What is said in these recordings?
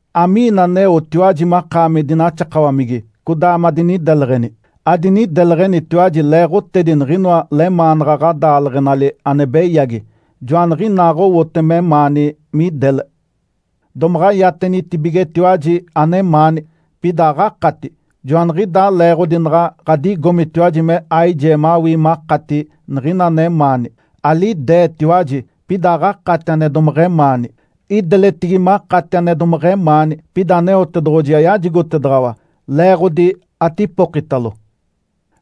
Amiina aneotiwaji makaami dinaxakawamigi, codaa madinideleɡ̶eni? Adinideleɡ̶enitiwaji leeɡ̶otedi niɡ̶inoa lemaanaɡ̶a ɡ̶adaaleɡ̶enali ane beyagi, joaniɡ̶inaaɡ̶owote memaani midele. Domaɡ̶a iatenitibigetiwaji anemaani, pida aɡ̶akati, joaniɡ̶idaa leeɡ̶odi naɡ̶a ɡ̶adigomitiwaji me aijee mawii makati niɡ̶ina anemaani. Alideetiwaji, pida aɡ̶akati ane domeɡ̶emaani. Ideletigi makati ane domeɡ̶emaani, pida Aneotedoɡ̶oji ayajigotedaɡ̶awa leeɡ̶odi atipokitalo.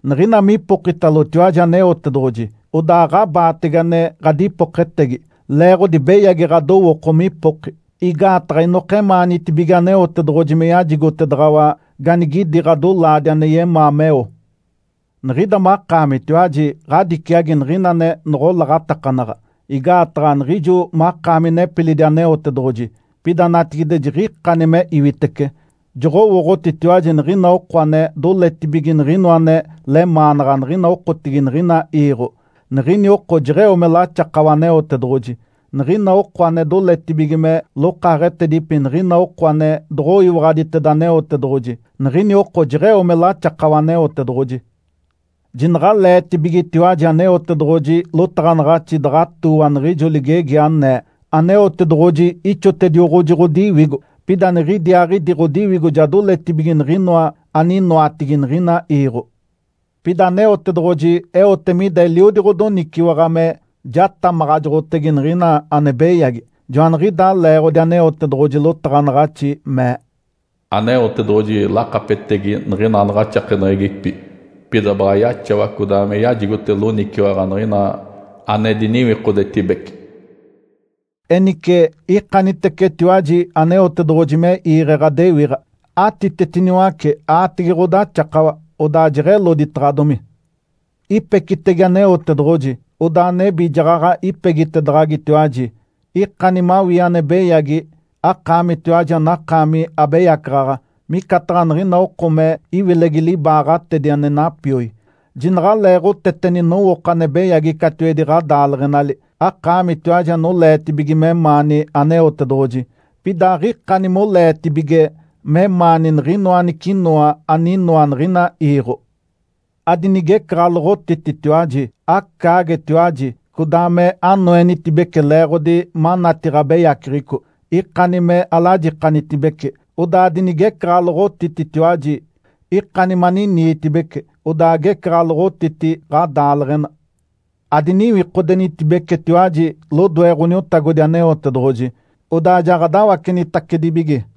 Niɡ̶ina mipokitalotiwaji Aneotedoɡ̶oji, odaa aɡ̶abaatege ane ɡ̶adipoketegi, leeɡ̶odi beyagi ɡ̶adowooko mipoki. Igaataɡ̶a inokemaanitibige Aneotedoɡ̶oji me yajigotedaɡ̶awa ganigidi ɡ̶adolaadi ane yemaa meo. Niɡ̶ida makaamitiwaji ɡ̶adiciagi niɡ̶ina ane noɡ̶olaɡ̶atakanaɡ̶a, igaataɡ̶a jiɡ̶ijo makaami nepilidi Aneotedoɡ̶oji, pida natigide jiɡ̶ikani me iwitece. Joɡ̶owooɡ̶otitiwaji niɡ̶ina oko ane doletibige niɡ̶inoa ane lemaanaɡ̶a niɡ̶ina okotigi niɡ̶ina iiɡ̶o, niɡ̶ini oko jeɡ̶eo me laxakawa Aneotedoɡ̶oji. Niɡ̶ina oko ane doletibige me lokaaɡ̶etedipi niɡ̶ina oko ane doɡ̶oyiwaɡ̶aditeda Aneotedoɡ̶oji, niɡ̶ini oko jeɡ̶eo me laxakawa Aneotedoɡ̶oji. Jinaɡ̶aleetibigetiwaji Aneotedoɡ̶oji lotaɡ̶anaɡ̶axi daɡ̶atooa niɡ̶ijo ligegi, anee, “Aneotedoɡ̶oji ixotedioɡ̶oji ɡ̶odiwigo. Pida niɡ̶idiaaɡ̶idi ɡ̶odiwigo ja doletibige niɡ̶inoa aninoatigi niɡ̶ina iiɡ̶o.” Pida Aneotedoɡ̶oji eote mida eliodi ɡ̶odoniciwaɡ̶a me jatamaɡ̶ajoɡ̶otege niɡ̶ina ane beyagi. Joaniɡ̶idaa leeɡ̶odi Aneotedoɡ̶oji lotaɡ̶anaɡ̶axi mee, “Aneotedoɡ̶oji lakapetegi niɡ̶ina anaɡ̶axakeneɡ̶egipi, pida baɡ̶a yaxawa codaa me yajigote loniciwaɡ̶a niɡ̶ina ane diniwikodetibece.” Enice, ikanitecetiwaji Aneotedoɡ̶oji me iiɡ̶e ɡ̶adewiɡ̶a. Atitetiniwace aatege ɡ̶odaxakawa, odaa jeɡ̶eloditaɡ̶adomi. Ipecitege Aneotedoɡ̶oji, odaa nebi jaɡ̶aɡ̶a ipegitedaɡ̶agitiwaji. Ikani mawii ane beyagi, akaamitiwaji anakaami abeyacaɡ̶aɡ̶a, micataɡ̶a niɡ̶ina oko me iwilegi libaaɡ̶atedi ane napioi. Jinaɡ̶aleeɡ̶oteteni nowooko ane beyagi catiwedi ɡ̶adaaleɡ̶enali, akaamitiwaji anoleetibige memaani Aneotedoɡ̶oji, pida aɡ̶ikani moleetibige memaani niɡ̶inoa anicinoa aninoa niɡ̶ina iiɡ̶o. Adinigecaɡ̶aloɡ̶otititiwaji, acaagetiwaji, codaa me anoenitibece leeɡ̶odi manati ɡ̶abeyaceɡ̶eco. Ikani me alajikanitibece, odaa adinigecaɡ̶aloɡ̶otititiwaji. Ikani maniniitibece, odaa agecaɡ̶aloɡ̶otiti ɡ̶adaaleɡ̶ena. Adiniwikodenitibecetiwaji lodoe Ǥoniotagodi Aneotedoɡ̶oji, odaa jaɡ̶adawacenitacedibige.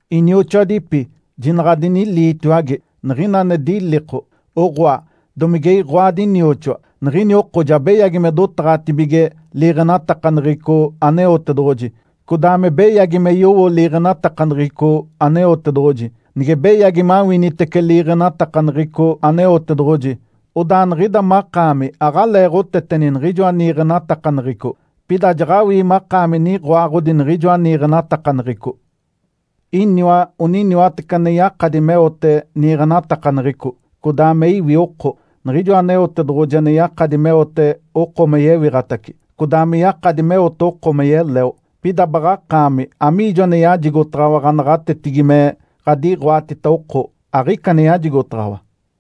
Inioxoadipi, jinaɡ̶adiniliitiwage. Niɡ̶ina ane diliko, oɡ̶oa, domige iɡ̶oadi nioxoa, niɡ̶ini oko ja beyagi me dotaɡ̶atibige liiɡ̶enatakaneɡ̶eco Aneotedoɡ̶oji, codaa me beyagi me yowo liiɡ̶enatakaneɡ̶eco Aneotedoɡ̶oji. Nige beyagi mawinitece liiɡ̶enatakaneɡ̶eco Aneotedoɡ̶oji, odaa niɡ̶ida makaami aɡ̶aleeɡ̶oteteni niɡ̶ijoa niiɡ̶enatakaneɡ̶eco, pida jaɡ̶awii makaami niɡ̶oaɡ̶odi niɡ̶ijoa niiɡ̶enatakaneɡ̶eco. Iniwa oniniwatece ane yakadi meote niiɡ̶enatakaneɡ̶eco, codaa me iwi oko, Niɡ̶ijoa Aneotedoɡ̶oji ane yakadi meote oko me yewiɡ̶atace, codaa me yakadi meote oko me yeleo. Pida, baɡ̶akaami, amiijo ane yajigotaɡ̶awa ɡ̶anaɡ̶atetigi me ɡ̶adiɡ̶oatita oko? Aɡ̶ica ane yajigotaɡ̶awa!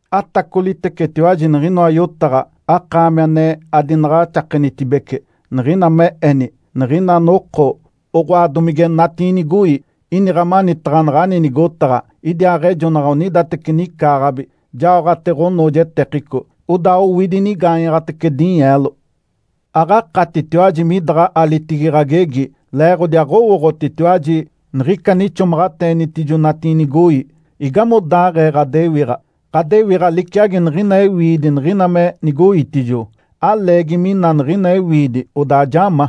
Atacolitecetiwaji niɡ̶inoa yotaɡ̶a, akaami ane adinaɡ̶axakenitibece, niɡ̶ina me eni, “Niɡ̶ina noko, oɡ̶oa, domige natiinigoi, iniɡ̶a manitaɡ̶a naɡ̶ani nigotaɡ̶a. Idiaaɡ̶ejonaɡ̶a onidateci nicaaɡ̶abi, jaoɡ̶ate ɡ̶onoojetekico, odaa owidi inigaanyaɡ̶atece dinyeelo.” Aɡ̶akatitiwaji midaɡ̶a alitigi ɡ̶agegi leeɡ̶odi aɡ̶owooɡ̶otitiwaji niɡ̶ica ane ixomaɡ̶ateenitijo natiinigoi. Igamodaaɡ̶ee ɡ̶adewiɡ̶a? Ǥadewiɡ̶a liciagi niɡ̶ina ewiidi niɡ̶ina me nigoitijo. Aleegi mina niɡ̶ina ewiidi, odaa ja ma.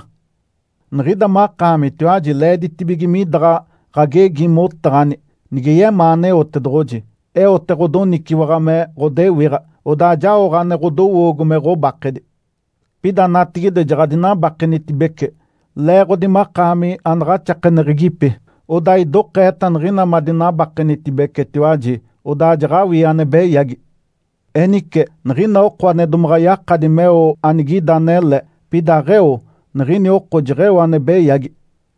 Niɡ̶ida makaamitiwaji leeditibige midaɡ̶a ɡ̶agegi motaɡ̶ani, “Nige yemaa Aneotedoɡ̶oji, eote ɡ̶odoniciwaɡ̶a me ɡ̶odewiɡ̶a, odaa jaoɡ̶a ane ɡ̶odowoogo me ɡ̶obakedi.” Pida natigide, jaɡ̶adinabakenitibece leeɡ̶odi makaami anaɡ̶axakeneɡ̶egipi. Odaa idokeeta niɡ̶ina madinabakenitibecetiwaji, odaa jaɡ̶awii ane beyagi. Enice, niɡ̶ina oko ane domaɡ̶a yakadi meo anigida anele, pida aɡ̶eo, niɡ̶ini oko jeɡ̶eo ane beyagi.